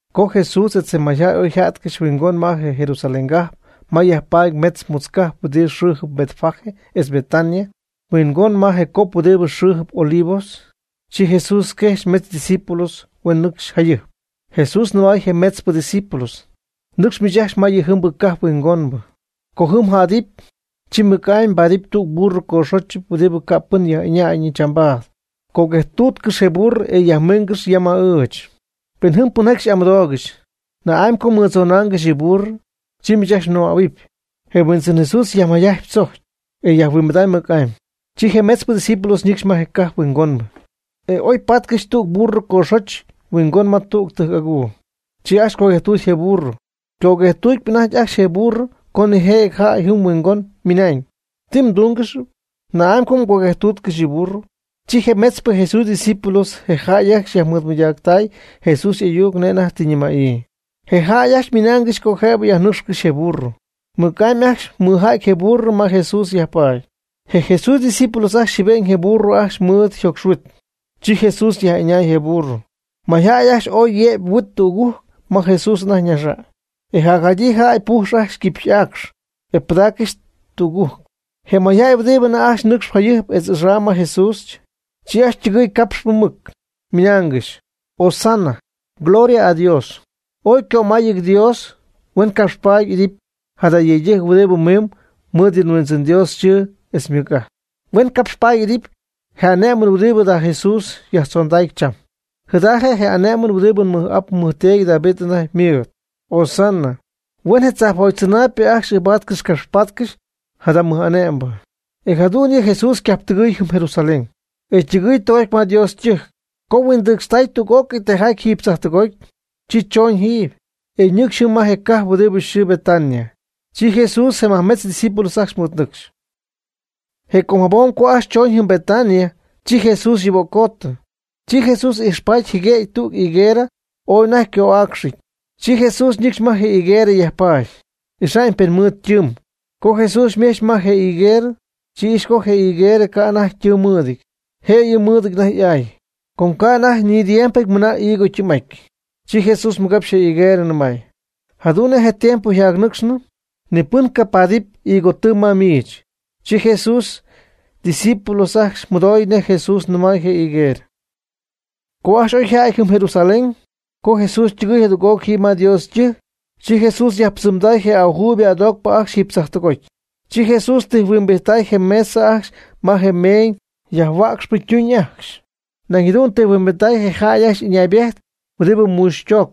Co Jesús etz je mayjäy oyjá'tcɨxy huingon ma je Jerusalén cajp ma yajpaady mejtz mutz cajp huɨdi xɨɨjɨpy Betfagé etz Betania, huingon ma je cop huɨdibɨ xɨɨjɨp Olivos, chi Jesús quejxy metz ydiscípulos huen nɨcxy jayɨjp. Jesús nɨmay je metzpɨ ydiscípulos: ―Nɨcx miich ajcxy ma yɨjɨmbɨ cajp huingonbɨ. Co jɨm mjädɨpy, chi mɨc'amy mbaadɨp tüg burro ycoxóchɨty huɨdibɨ ca' pɨn yaj'ɨñayñɨ chambaad. Coguejtuutcɨx je burro e yajmiingɨx ya ma ɨɨch. Pen jɨm pɨnjaty xy'amɨdoogɨxy: “¿Na'amy co mmɨdzonaangɨxy yɨ burro?” Chi miich ajcxy mnɨmähuɨpy: “Je Huindzɨn (Jesús) yajtunamyb tzojc, e yajhuimbidamy mɨc'amy.” Chi je metzpɨ ydiscípulos ñɨcxy ma je cajp huingonbɨ, e oypaatcɨxy tüg burro ycoxóchɨty huingon ma tüg tɨjc'aguu. Chi ajcxy coguejtuuty je burro. Ycoguejtuutyp anajty ajcxy je burro co nijëjɨty jäy jɨm huingon ymɨnañ: ―¿Ti mdungɨxyp? ¿Na'amy co mgoguejtuutcɨxy yɨ burro? Chi je metzpɨ Jesús ydiscípulos je jäy ajcxy yajmɨɨdmɨydacy Jesús y'ayuc nej anajty tɨ ñɨmäyii. Je jäy ajcxy ymɨnaangɨxy co jëb yajnɨ́cxcɨxy je burro. Mɨc'amy ajcxy mɨja'ty je burro ma Jesús yajpaady. Je Jesús ydiscípulos ajcxy jɨɨbe'ñ je burro ajcxy mɨɨd yjocxhuit, chi Jesús yaj'ɨñay je burro. Mayjäy ajcxy ooy yëby yhuit tügujc ma Jesús anajty ñaxa'ñ, e jacjadyii jäy pujxy ajcxy quipy'aacx, e pɨdaaccɨxy tügujc. Je mayjäy huɨdibɨ anajty ajcxy nɨcxp jayɨjp etz axam ma Jesús, chi ajcxy ytɨgɨɨy capxp mɨc, ymɨnaangɨxy: ―¡Hosana! ¡Gloria a Dios, ooy ycömáyɨty Dios! Huen capxpaady y'idɨpy jada yëydɨjc huɨdibɨ mimb mɨɨd yɨ nHuindzɨn Dios yxɨɨ etz ymɨc'ajt. Huen capxpaady y'idɨpy je ané'mɨn huɨdibɨ jada Jesús yajtzondacp cham. Jada je' je ané'mɨn huɨdibɨ nmɨj'ap nmɨjteedy David anajty ymɨɨd. Hosana, huen je tzajpjoty tzɨnaayb ajcxy ɨɨbaatcɨxy capxpaatcɨxy jada mɨj'ane'mbɨ. E jadu'ñyɨ Jesús ycajptɨgɨɨy jɨm Jerusalén, e ytɨgɨɨy tɨgoty ma Dios ytɨjc. Co huindɨcxtay tüg'ócɨy tijaty jiiby tzajtɨgoty, chi chooñ jiiby, e ñɨcxy jɨm ma je cajp huɨdibɨ yxɨɨ Betania. Chi Jesús je majmetz ydiscípulos ajcxy mɨɨdnɨcxy. Je com jabom co ajcxy chooñ jɨm Betania, chi Jesús yuböccootɨ. Chi Jesús ijxpaty jɨguëgy tüg higuerɨ ooy anajty yco'aayɨty. Chi Jesús ñɨcxy ma je higuerɨ yajpaady, ixa'ñ pen ymɨɨd ytɨɨm. Co Jesús ymech ma je higuerɨ, chi ijxy co je higuerɨ ca' anajty ytɨɨm mɨɨdɨty, jëyɨ mɨɨdɨty anajty y'aay, com ca' anajty ni tiempɨty mɨna higo ytɨɨm'aty. Chi Jesús mɨgapxy je higuerɨ nɨmay: ―Jadu'n nej tiempo yjacnɨcxnɨ, ni pɨn cajacpaadɨpy higo tɨɨm ma miich. Chi Jesús ydiscípulos ajcxy mɨdoy nej Jesús nɨmay je higuerɨ. Co ajcxy oy yjädy jɨm Jerusalén, co Jesús ytɨgɨy jadüg'oc jiiby ma Dios ytɨjc, chi Jesús yajpɨdzɨmday je ajuuybɨ adoocpɨ ajcxy jiiby tzajptɨgoty. Chi Jesús tijhuimbijtay je mesa ajcxy me je meeñ yajhuäcxpɨ ytuñ ajcxy. Nañ jadu'n tijhuimbijty je jäy ajcxy ɨñaybejt huɨdibɨ muuxy toocp.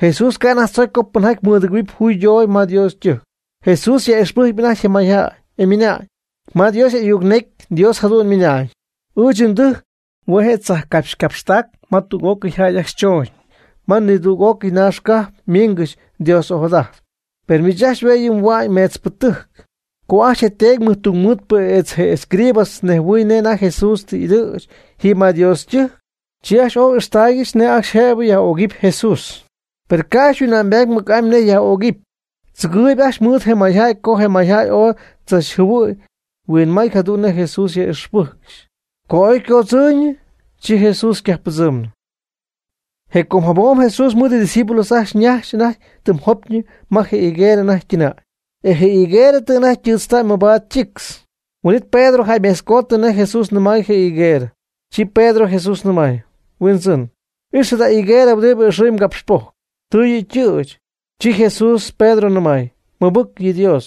Jesús ca' anajty tzocy co pɨnjaty mɨdɨgɨ̈huɨpy juydoogy ma Dios ytɨjc. Jesús yaj'ixpɨjcpy anajty je mayjäy, e ymɨnañ: ―Ma Dios y'ayuc necy Dios jadu'n ymɨnañ: “Ɨɨch ndɨjc hue' je' tzajpcapxcapxtac ma tüg'ócɨy jäy ajcxy chooñ ma nidüg'ócɨy naax cajp ymiingɨxy Dios ojadajtp”, per miich ajcxy hue' yɨ' mhua'ñ meetzpɨtɨjc. Co ajcxy je teedy mɨjtungmɨɨdpɨ etz je escribas nejhuɨɨy nej anajty Jesús tɨ y'ɨdɨ̈ch jiiby ma Dios ytɨjc, chi ajcxy ooy ijxtaaygɨxy nej ajcxy jëb yaj'ögɨpy Jesús. Per ca' ajcxy yhuinma'ñybaady mɨc'amy nej yaj'ögɨpy, tzɨgɨɨyb ajcxy mɨɨd je mayjäy com je mayjäy ooy tzachjɨhuɨy huinmay jadu'n nej Jesús yaj'ixpɨ́jcɨgɨxy. Co oycoodzɨɨyñɨ, chi Jesús ycajppɨdzɨmy. Je com jabom Jesús mɨɨd ydiscípulos ajcxy najxp anajty tɨm jopyñɨ ma je higuerɨ anajty ytɨnäy. E je higuerɨ tɨ anajty ytɨɨtztay mabaad ytictz. Huin'it Pedro jäymejtzcooty nej Jesús nɨmay je higuerɨ, chi Pedro Jesús nɨmay: ―Huindzɨn, ix jada higuerɨ huɨdibɨ ɨxɨy mgapxpojc, tɨ yɨ' ytɨ̈ch. Chi Jesús Pedro nɨmay: ―Mɨbɨc yɨ Dios.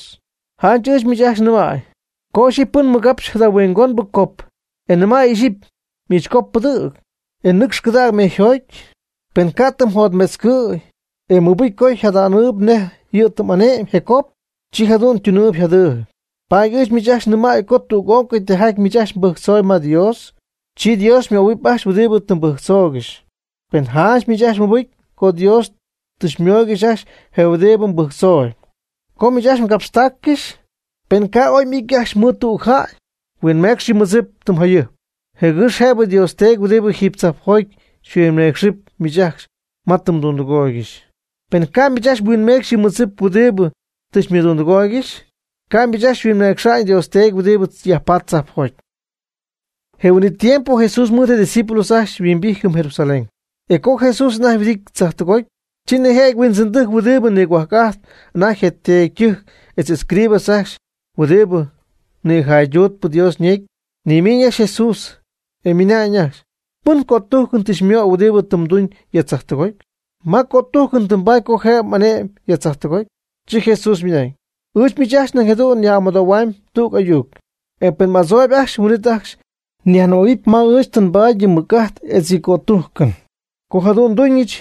Janch ɨɨch miich ajcxy nɨmäy, co ixyipy pɨn mɨgapxy jada huingonbɨ cop, e nɨmäy ixyipy: “Miich cop pɨdɨ̈g, e nɨcx cɨdäg mejyjoty”, pen ca' ti mɨjotmetzcɨɨy, e mɨbɨcy co jadaanɨp nej yɨ' tɨ ane'my je cop, chi jadu'n ytunɨɨyb yjadɨɨyb. Paady ɨɨch miich ajcxy nɨmäy co tüg'ócɨy tijaty miich ajcxy mbɨjctzooyb ma Dios, chi Dios xymöhuɨpy ajcxy huɨdibɨ tɨ mbɨjctzoogɨxy. Pen janch miich ajcxy mɨbɨcy co Dios tɨ xymooygɨxy ajcxy je huɨdibɨ tɨ mbɨjctzooyb. Co miich ajcxy mgapxtaaccɨxy, pen ca' oy m'ity ajcxy mɨɨd tüg jäy, huinmécxcɨx yɨ mmɨdzip tɨm jayɨjp, jɨgɨx jëbɨ Dios Teedy huɨdib jiiby tzajpjoty xyhuinmeecxɨp miich ajcxy ma tɨ mdundɨgooygɨxy. Pen ca' miich ajcxy mhuinmecxy yɨ mmɨdzip huɨdibɨ tɨ xymɨdundɨgooygɨxy, ca' miich ajcxy xyhuinmecxa'ñ Dios Teedy huɨdibɨ yajpatp tzajpjoty. Je huin'it tiempo Jesús mɨɨd je' ydiscípulos ajcxy yhuimbijty jɨm Jerusalén. E co Jesús anajty yhuɨdity tzajtɨgoty, chi nijëjɨty huindzɨndɨjc huɨdibɨ nigohuajc'ajtp anajty je teedytɨjc etz escribas ajcxy huɨdibɨ nïjayduutpɨ Dios ñecy, nimiiñ ajcxy Jesús, e ymɨnañ ajcxy: ―¿Pɨn cötújcɨn tɨ xymöy huɨdibɨ tɨ mduñ ya tzajtɨgoty? ¿Ma cötújcɨn tɨ mbaady co jëb m'ane'my ya tzajtɨgoty? Chi Jesús ymɨnañ: ―Ɨɨch miich ajcxy nañ jadu'n nyaj'amɨdohuamyb tüg ayuc. E pen mni'adzooyb ajcxy, huin'it ajcxy nyajnɨmähuɨpy ma ɨɨch tɨ nbaady yɨ mɨc'ajt etz yɨ cötújcɨn, co jadu'n nduñɨch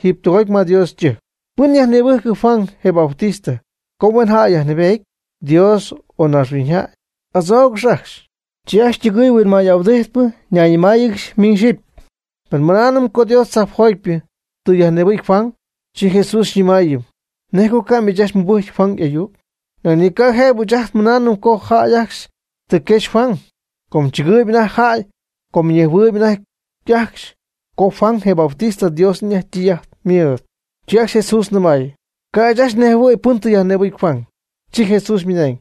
jiiby tɨgoty ma Dios ytɨjc. ¿Pɨn yajnïbɨjc Juan, je Bautista, co huen jäy yajnɨɨbety? ¿Dios, o naaxhuiñyjäy? Adzoogɨch ajcxy. Chi ajcxy ytɨgɨɨy huinmay'ahuɨdijtpɨ, ñayñɨmáayɨgɨxy miñ xyɨpy: ―Pen mɨnaanɨm co Dios tzajpjotypɨ tɨ yajnïbɨcy Juan, chi Jesús xyñɨmáayɨmɨpy: “¿Nej co ca' miich ajcxy mɨbɨjcy Juan y'ayuc?” Nañ ni ca' jëbɨ ɨɨch ajt nmɨnaanɨm co jäy ajcxy tɨ quejxy Juan. Com chɨgɨɨyb anajty jäy com ñejhuɨɨyb anajty ajcxy co Juan je Bautista Dios anajty ytɨy'ajt ymɨɨd. Chi ajcxy Jesús nɨmay: ―Ca' ɨɨch ajcxy nejhuɨy pɨn tɨ yajnïbɨcy Juan. Chi Jesús ymɨnañ: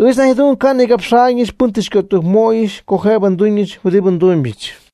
―Ɨɨch nañ jadu'n ca' nnigapxa'ñɨch pɨn tɨ xycötujcmöyɨch co jëb nduñɨch huɨdibɨ ndumybɨch.